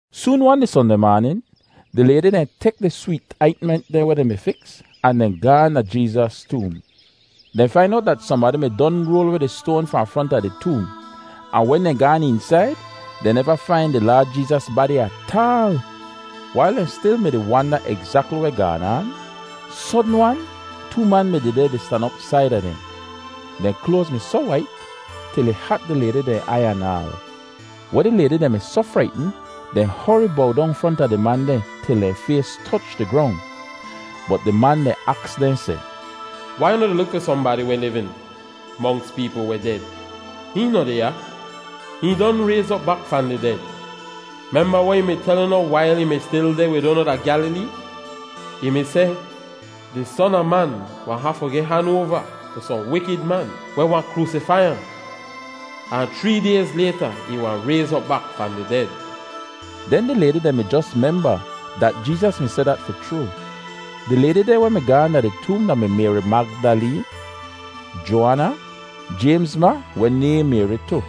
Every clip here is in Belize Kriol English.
Soon-wan di Sondeh maanin, di laydi dehn tek di sweet aintment dehn weh dehn mi fiks ahn dehn gaahn da Jeezas toom. Dehn fain owt dat sohnbadi mi don roal weh di stoan fahn fronta di toom. Ahn wen dehn gaan eensaid, dehn neva fain di Laad Jeezas badi ataal. Wail dehn stil mi-di wanda egzakli weh gaan aan, sodn-wan too man mi dehdeh di stan op saida dehn. Dehn kloaz mi soh wait til ih hat di laydi dehn aiy anaal. Weh di laydi dehn mi soh fraitn, dehn hori bow dong fronta di man dehn til dehn fays toch di grong. Bot di man dehn aks dehn seh, “Wai unu di luk fi sohnbadi weh livin monks peepl weh ded? Hihn noh deh ya; hihn don rayz op bak fahn di ded! Memba weh ih mi tel unu wail ih mi stil deh wid unu da Gyalilee? Ih mi seh, ‘Di Son a Man wahn hafu geh han oava tu sohn wikid man weh wahn kroosifai ahn. Ahn chree dayz layta ih wahn rayz op bak fahn di ded.’” Den di laydi dehn mi jos memba dat Jeezas mi seh dat fi chroo. Di laydi dehn weh mi gaahn da di toom da-mi Mayri Magdaleen, Joaana, Jaymz ma weh nayhn Mayri tu,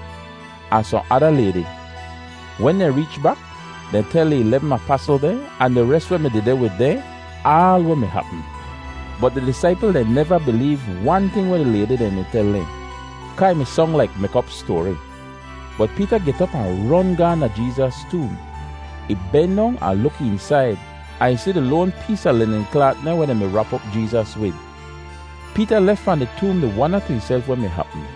ahn sohn ada laydi. Wen dehn reech bak, dehn tel di ilebm apasl dehn ahn di res weh mi dehdeh wid dehn aal weh mi hapm. Bot di disaipl dehn neva bileev wan ting weh di laydi dehn mi tel dehn, kaa ih mi song laik mek-op stoari. [Bot Peeta get op ahn ron gaahn da Jeezas toom. Ih ben dong ahn luk eensaid ahn ih si di loan pees a linin klaat dehn weh dehn mi rap op Jeezas wid. Peeta lef fahn di toom di wanda tu ihself weh mi hapm.]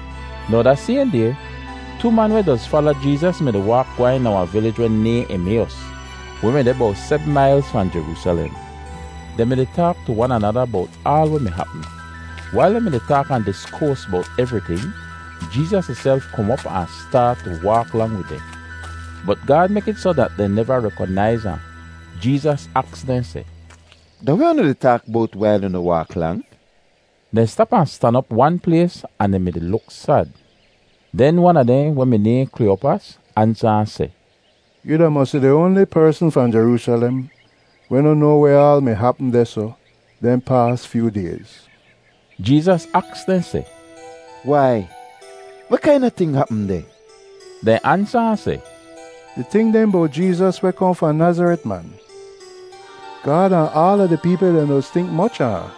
Now da sayhn day, too man weh doz fala Jeezas mi-di waak gwehn da wahn vilij weh nayhn Emayos, weh mi deh bowt sebm mailz fahn Jeroosalem. Dehn mi-di taak tu wan anada bowt aal weh mi hapm. Wail dehn mi-di taak ahn diskoas bowt evriting, Jeezas ihself kom op ahn staat tu waak lang wid dehn. Bot Gaad mek it soh dat dehn neva rekonaiz ahn. Jeezas aks dehn seh, “Da weh unu di taak bowt wail unu waak lang?” Dehn stap ahn stan op wan plays ahn dehn mi-di luk sad. Den wan a dehn weh mi nayhn Kliyopas ansa ahn seh, “Yoo da mosi di oanli persn fahn Jeroosalem weh noh noa weh aal mi hapm dehsoh dehn paas fyoo dayz.” Jeezas aks dehn seh, “Wai, weh kaina ting hapm deh?” Dehn ansa ahn seh, “Di ting dehn bowt Jeezas weh kohn fahn Nazaret, man. Gaad ahn aala di peepl dehn doz tink moch a ahn,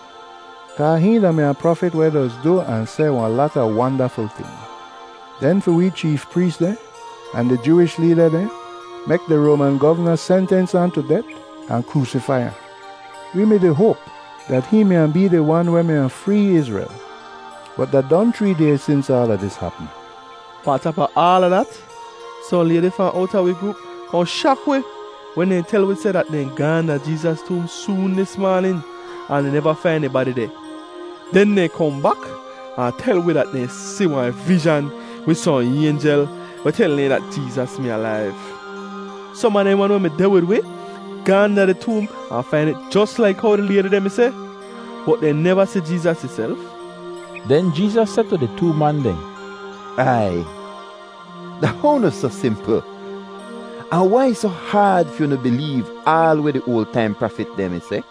kaa hihn da-mi wahn prafit weh doz du ahn seh wahn lata wandaful ting. Den fi wee cheef prees dehn ahn di Jooish leeda dehn mek di Roaman govna sentens ahn tu det ahn kroosifai ahn. Wee mi-di hoap dat hihn mi wahn bee di Wan weh mi wahn free Izrel, bot da don chree dayz sins aala dis hapm. Pahn tap a aala dat, sohn laydi fahn owta wi groop kohn shak wi wen dehn tel wi seh dat dehn gaahn da Jeezas toom soon dis maanin, ahn dehn neva fain ih badi deh. Den dehn kohn bak ahn tel wi dat dehn si wahn vizhan wid sohn aynjel weh tel dehn dat Jeezas mi alaiv. Som a dehn wan weh mi deh wid wi gaahn da di toom ahn fain it jos laik how di laydi dehn mi seh, bot dehn neva si Jeezas ihself.” Den Jeezas seh tu di too man dehn, “Aiy, da how unu soh simpl, ahn wai ih soh haad fi unu bileev aal weh di oal taim prafit dehn mi seh?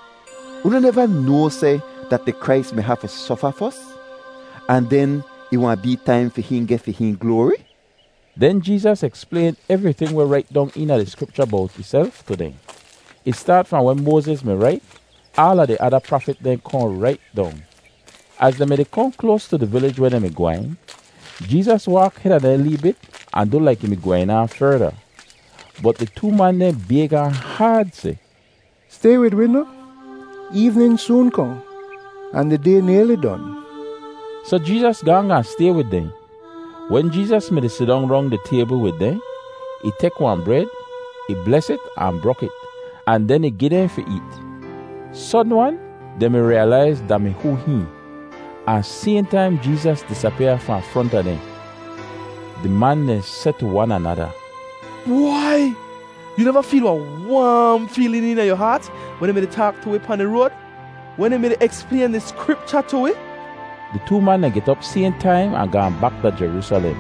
Unu neva noa seh dat di Krais mi hafu sofa fos, ahn den ih wahn bee taim fi hihn geh fi hihn gloari?” Den Jeezas eksplayn evriting weh rait dong eena di Skripcha bowt ihself tu dehn. Ih staat fahn weh Moaziz mi rait, den aala di ada prafit dehn kohn rait dong. Az dehn mi-di kohn kloas tu di vilij weh dehn mi gwehn, Jeezas waak heda dehn lee bit ahn du laik ih mi gwehn aan ferda. Bot di too man dehn bayg ahn haad seh, “Stay wid wi noh? Eevnin soon kohn, ahn di day nayli don.” Soh Jeezas gaahn gaahn stay wid dehn. Wen Jeezas mi-di sidong rong di taybl wid dehn, ih tek wahn bred, ih bles it ahn brok it, ahn den ih gi dehn fi eet. Sodn-wan dehn mi riyalaiz da-mi hoo hihn; ahn sayhn taim Jeezas disapyaa fahn fronta dehn. Di man dehn seh tu wan anada, “Bwai, yoo neva feel wahn waam feelin eena yu haat wen ih mi-di taak tu wi pahn di road, wen ih mi-di eksplayn di Skripcha tu wi?” Di too man dehn get op sayhn taim ahn gaahn bak da Jeroosalem.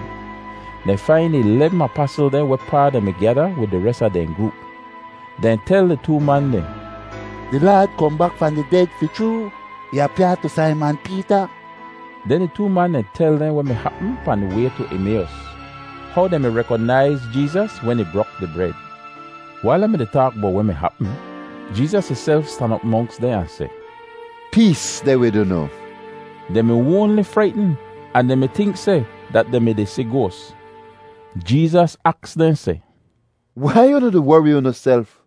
Dehn fain di ilebm apasl dehn wehpaa dehn mi gyada wid di res a dehn groop. Dehn tel di too man dehn, “Di Laad kohn bak fahn di ded fi chroo! Ih apyaa tu Saiman Peeta!” Den di too man dehn tel dehn weh mi hapm pahn di way tu Emayos, how dehn mi rekonaiz Jeezas wen ih brok di bred. Wail dehn mi-di taak bowt weh mi hapm, Jeezas ihself stan op monks dehn ahn seh, “Pees deh wid unu!” Dehn mi oanli fraitn, ahn dehn mi tink seh dat dehn mi-di si goas! Jeezas aks dehn seh, “Wai unu di wori unuself?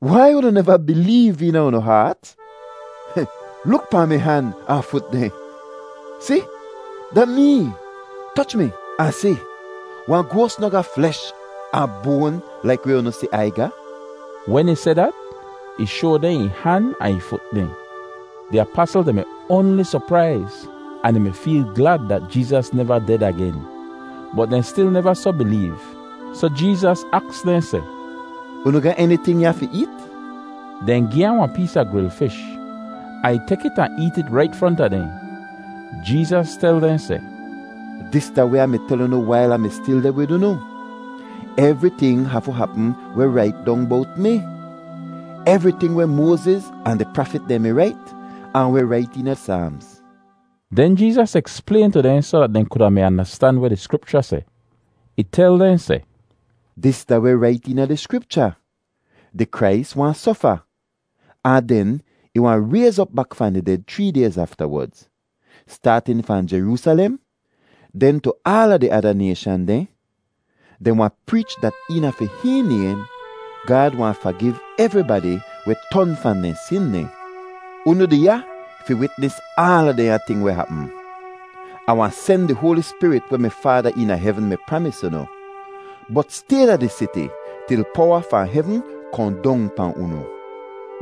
Wai unu neva bileev eena unu haat? Luk pahn mi han ahn fut dehn. Si, da mee! Toch mi ahn si. Wahn goas noh ga flesh ahn boan laik weh unu si Ai ga.” [Wen ih seh dat, ih shoa dehn ih han ahn ih fut dehn.] Di apasl dehn mi oanli sopraiz ahn dehn mi feel glad dat Jeezas neva ded agen, bot dehn stil neva soh bileev, soh Jeezas aks dehn seh, “Unu ga eniting ya fi eet?” Dehn gi ahn wahn pees a gril fish, ahn ih tek it ahn eet it rait fronta dehn. Jeezas tel dehn seh, “Dis da weh Ah mi tel unu wail Ah mi stil deh wid unu: Evriting hafu hapm weh rait dong bowt mi—evriting weh Moaziz ahn di prafit dehn mi rait, ahn weh rait eena Saamz.” Den Jeezas eksplayn tu dehn soh dat dehn kuda mi andastan weh di Skripcha seh. Ih tel dehn seh, “Dis da weh rait eena di Skripcha: Di Krais wahn sofa, ahn den ih wahn rayz op bak fahn di ded chree dayz aftawodz. Staatin fahn Jeroosalem, den tu aala di ada nayshan dehn, dehn wahn preech dat eena fi hihn naym Gaad wahn fagiv evribadi weh ton fahn dehn sin dehn. Unu deh ya fi witnis aala dehnya ting weh hapm. Ah wahn sen di Hoali Spirit weh mi Faada eena hevn mi pramis unu. Bot stay da di siti til powa fahn hevn kohn dong pahn unu.”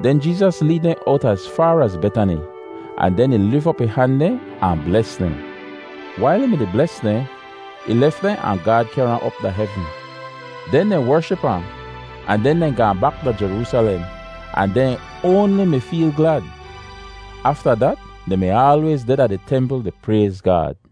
Den Jeezas leed dehn owt az faar az Betani, ahn den ih lif op ih han dehn ahn bles dehn. Wail ih mi-di bles dehn, ih lef dehn ahn Gaad kehr ahn op da hevn. Den dehn wership ahn, ahn den dehn gaahn bak da Jeroosalem ahn dehn oanli mi feel glad. Afta dat dehn mi aalwayz deh da di templ di prayz Gaad.